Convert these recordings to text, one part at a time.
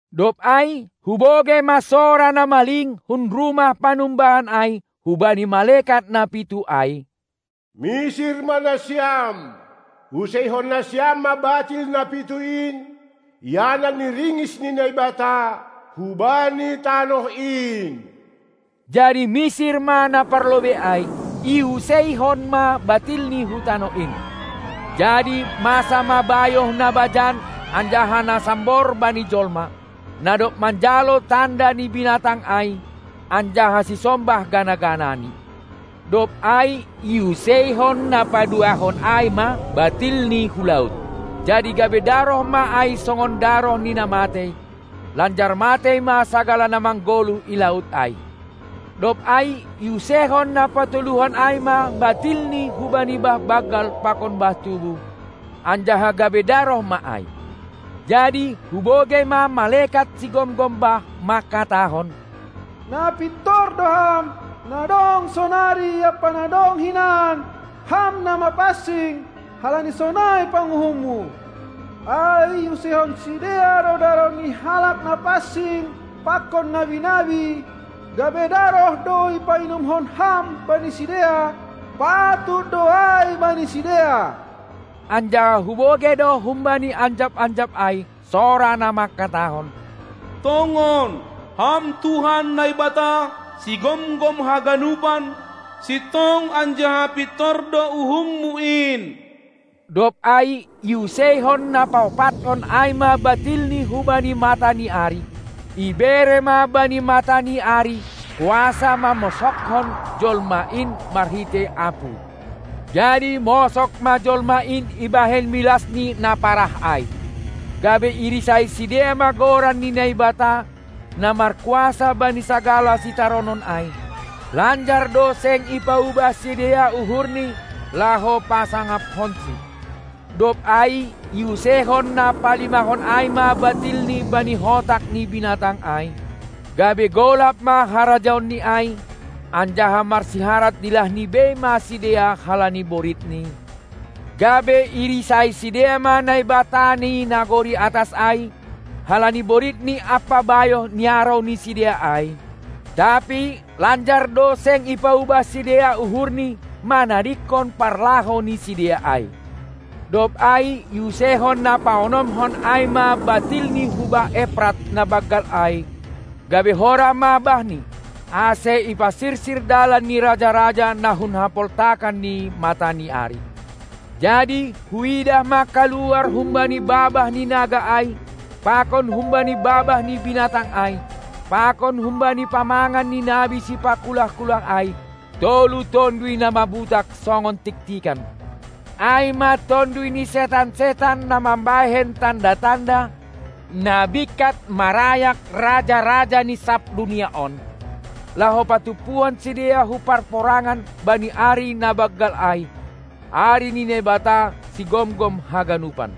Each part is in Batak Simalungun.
Dob ai hubogei ma sora na maling hun rumah panumbahan ai hubani malekat na pitu ai: Misir ma nasiam, useihon nasiam ma batil na pitu in, ianan ni ringis ni Naibata, hubani tanoh in. Jadi misir ma na parlobei ai, iuseihon ma batilni hu tanoh in. Jadi masa ma bayoh na bajan anjaha na sambor bani jolma, na dob manjalo tanda ni binatang ai anjaha sisombah gana-ganani. Dob ai iuseihon na paduahon ai ma batilni hu laut; jadi gabe daroh ma ai songon daroh ni na matei, lanjar matei ma sagala na manggoluh i laut ai. Dob ai iuseihon na patoluhon ai ma batilni hubani bah banggal pakon bah tubuh, anjaha gabe daroh ma ai. Jadi hubogei ma malekat sigomgom bah manghatahon: Na pintor do Ham, na dong sonari ampa na dong hinan, Ham na mapansing, halani sonai panguhumMu; ai iuseihon sidea do daroh ni halak na pansing pakon nabi-nabi, gabe daroh do ipainumkon Ham bani sidea; patut do ai bani sidea. Anjaha hubogei do humbani anjap-anjap ai sora na manghatahon: Tongon, Ham Tuhan Naibata, Sigomgom haganupan, sintong anjaha pintor do uhumMu in. Dob ai iuseihon na paompathon ai ma batilni hubani mata ni ari; ibere ma bani mata ni ari kuasa mammosoghon jolma in marhitei apuy. Jadi mosog ma jolma in ibahen milasni na parah ai, gabe irisai sidea ma goran ni Naibata, na markuasa bani sagala sitaronon ai; lanjar do seng i paubah sidea uhurni laho pasangaphonSi. Dob ai iuseihon na palimahon ai ma batilni bani hotak ni binatang ai, gabe golap ma harajaonni ai, anjaha marsiharat dilahni bei ma sidea halani boritni, gabe irisai sidea ma Naibata ni nagori atas ai halani boritni ampa bayoh niarou ni sidea ai, tapi lanjar do seng ipaubah sidea uhurni manadingkon parlahou ni sidea ai. Dob ai iuseihon na paonomhon ai ma batilni hu bah Eprat na banggal ai, gabe horah ma bahni, ase ipasirsir dalan ni raja-raja na hun hapoltakan ni mata ni ari. Jadi huidah ma kaluar humbani babah ni naga ai pakon humbani babah ni binatang ai pakon humbani pamangan ni nabi sipakulah-kulah ai tolu tonduy na mabutak songon tiktikan. Ai ma tonduy ni setan-setan na mambahen tanda-tanda, na bingkat marayak raja-raja ni sab dunia on, laho patumpuhon sidea hu parporangan bani ari na banggal ai, ari ni Naibata, Sigomgom haganupan.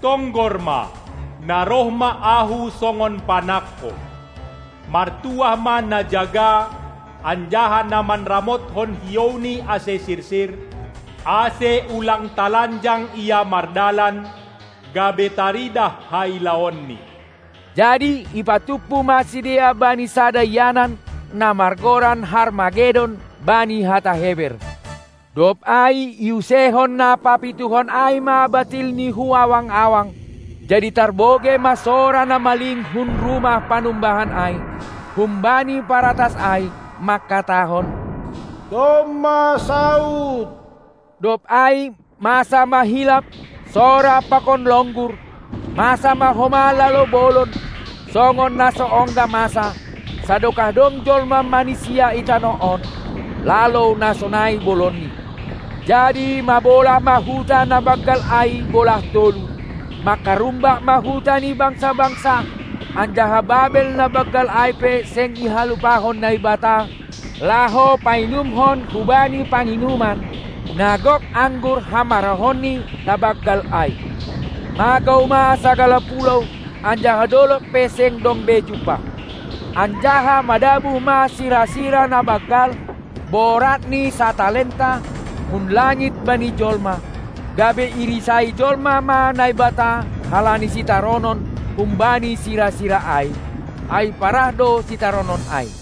Tonggor ma, na roh ma Ahu songon panangko. Martuah ma na jaga anjaha na manramothon hiouni ase sirsir, ase ulang talanjang ia mardalan, gabe taridah hailaonni. Jadi ipatumpu ma sidea bani sada ianan, na margoran Harmagedon bani hata Heber. Dob ai iuseihon na papituhon ai ma batilni hu awang-awang, jadi tarbogei ma sora na maling hun rumah panumbahan ai, humbani paratas ai, manghatahon: Domma saud! Dob ai masa ma hilap, sora pakon longgur, masa ma homa lalou bolon, songon na so ongga masa, sadokah dong jolma manisia i tanoh on, lalou na sonai bolonni. Jadi mabolah ma huta na banggal ai bolah tolu, mangkarumbak ma huta ni bangsa-bangsa, anjaha Babel na banggal ai pe seng ihalupahon Naibata laho painumhon hubani panginuman, na gok anggur hamarahonNi na banggal ai. Magou ma sagala pulou, anjaha dolog pe seng dong be jumpah. Anjaha madabuh ma sira-sira na banggal, boratni satalenta, hun langit bani jolma, gabe irisai jolma ma Naibata halani sitaronon humbani sira-sira ai; ai parah do sitaronon ai.